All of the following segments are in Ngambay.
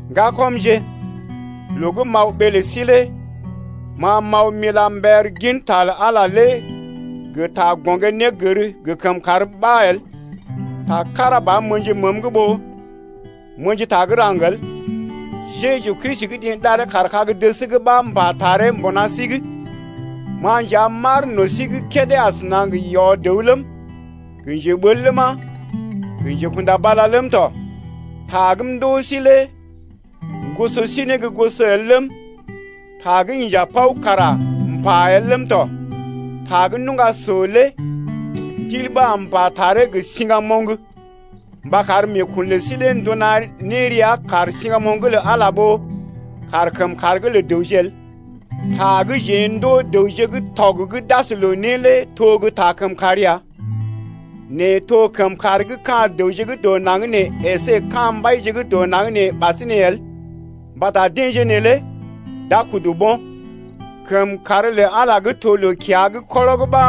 Ŋgakɔmje, loo gə́ m’aw ɓee lə sí lé ma m’aw m’ila mber ginta lə Ala lé gə ta gɔŋgé-négər gə kəmkàr ɓa el. Ta kára ba m’ə̰ji məəm’g ɓó m’ə̰ji ta gə́ raŋg el. Jeju Kristi gə́ deḛ ɗaree kaar kag-dəs’g ɓa m’pa taree mbuna sí’g. Ma nja m’aar no̰ sí’g kédé asəna gə yɔ-dəw ləm, gə njeɓel ləma, gə njekunda bala ləm tɔ. Ta gə́ m’ndoo sí lé m’goso sí ne gə́ goso el ləm, ta gə́ inja paw kara m’pa el ləm tɔ. Ta gə́ nuŋga so lé Ndil ɓa am m’pa taree gə siŋgamoŋ mba kar meekun lə sí lé nduna ne rəa kaar siŋgamoŋ’g lə Ala ɓó kaar kəmkàr’g lə dəwje el. Ta gə́ jeḛ ndoo dəwje gə́ tɔg gə́ d’as ne loo lé to gə́ ta kəmkàr ya, nɛ to kəmkàr gə́ ka̰ dəwje gə́ dɔ naŋg nee əsé ka̰ mbaije gə́ dɔ naŋg nee ɓasinè el mbata deḛje neelé d’a kudu bo̰. Kəmkàr lə Ala gə́ to loo-kiya’g kɔrɔg ɓa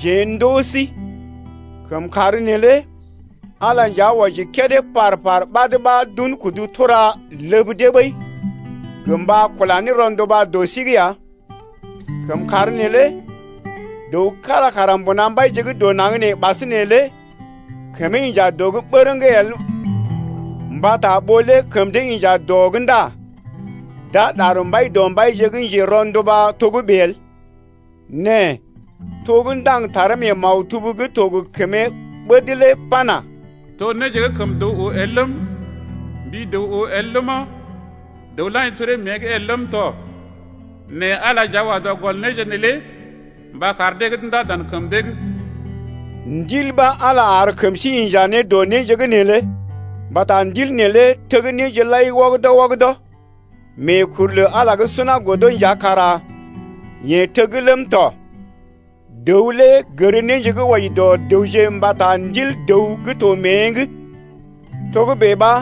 jeḛ ndoo sí. Kəmkàr neelé Ala nja wɔji kédé par-par ɓad ɓa d’un kudu tura ləb dee ɓəi gə mba kula ne rɔnduba dɔ sí’g ya. Kəmkàr neelé dəw kára kara mbuna mbaije gə́ dɔ naŋg nee ɓasinè lé kəmee inja dɔ’g bərəŋ el mbata ɓó lé kəm dee inja dɔ’g ndá d’a ɗar Mbaidɔmbaije gə́ njero̰duba togə́bè el. Nɛ to gə́ ndaŋg taree mee maktub gə́ to gə kəmee ɓəd lé pana: To néje gə́ kəm dəw oo el ləm, Mbi dəw oo el ləma, Dəw la̰ji toree mée’g el ləm tɔ, Nɛ Ala nja wa dɔ gɔl néje neelé mba kar deḛ gə́ d’undá dan kəm dee’g. Ndil ɓa Ala ar kəm sí inja ne dɔ néje’g neelé. Mbata Ndil neelé teg néje lai wɔgədɔ-wɔgədɔ, meekuru lə Ala gə́ suna godo nja kara yeḛ teg ləm tɔ. Dəw lé gər néje gə́ wɔji dɔ dəwje mbata ndil dəw gə́ to mée’g. Togə́bè ɓa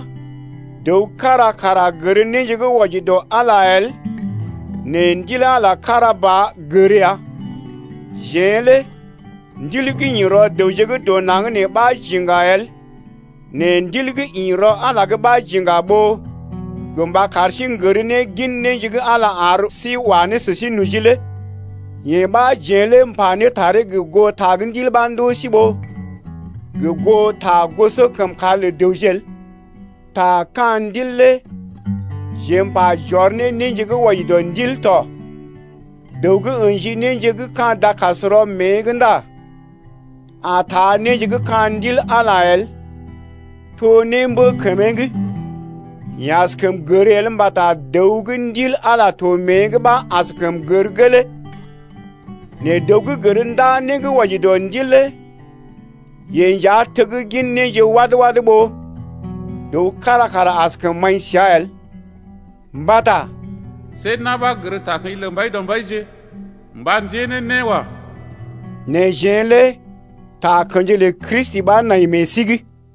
dəw kára kara gər néje gə́ wɔji dɔ Ala el nɛ Ndil Ala kára ba gər ya. Jeḛ lé ndil gə́ ḭ rɔ dəwje gə́ dɔ naŋg nee ɓa j’iŋga el, nɛ Ndil gə́ ḭ rɔ Ala’g ɓa j’iŋga ɓó gə mba kar sí n’gər ne gin néje gə́ Ala ar sí wa ne sə sí noji lé. Yee ɓa jeḛ lé m’pa ne taree gə goo ta gə́ Ndil ɓa ndoo sí ɓó gə goo ta gosɔkəmkàr lə dəwje el. Ta ka̰ Ndil lé jeḛ m’pa j’ɔr ne néje gə́ wɔji dɔ ndil tɔ. Dəw gə́ ə̰ji néje gə́ ka̰ dakasrɔ mée’g ndá a taa néje gə́ ka̰ Ndil Ala lé el, to némbə kəmee’g. Yeḛ askəm gər el mbata dəw gə́ Ndil Ala to mée’g ɓa askəm gər gelee ɓəi. Nɛ dəw gə́ gər ndaa né gə́ wɔji dɔ Ndil lé yeḛ nja teggin néje wad-wad ɓó dəw kára kara askəm maḭ səa el. Mbata See na̰ ɓa gər takə̰ji lə Mbaidɔmbaije Mba ndée ne né wa. Nɛ jeḛ lé takə̰ji lə Kristi ɓa nai meḛ sí’g.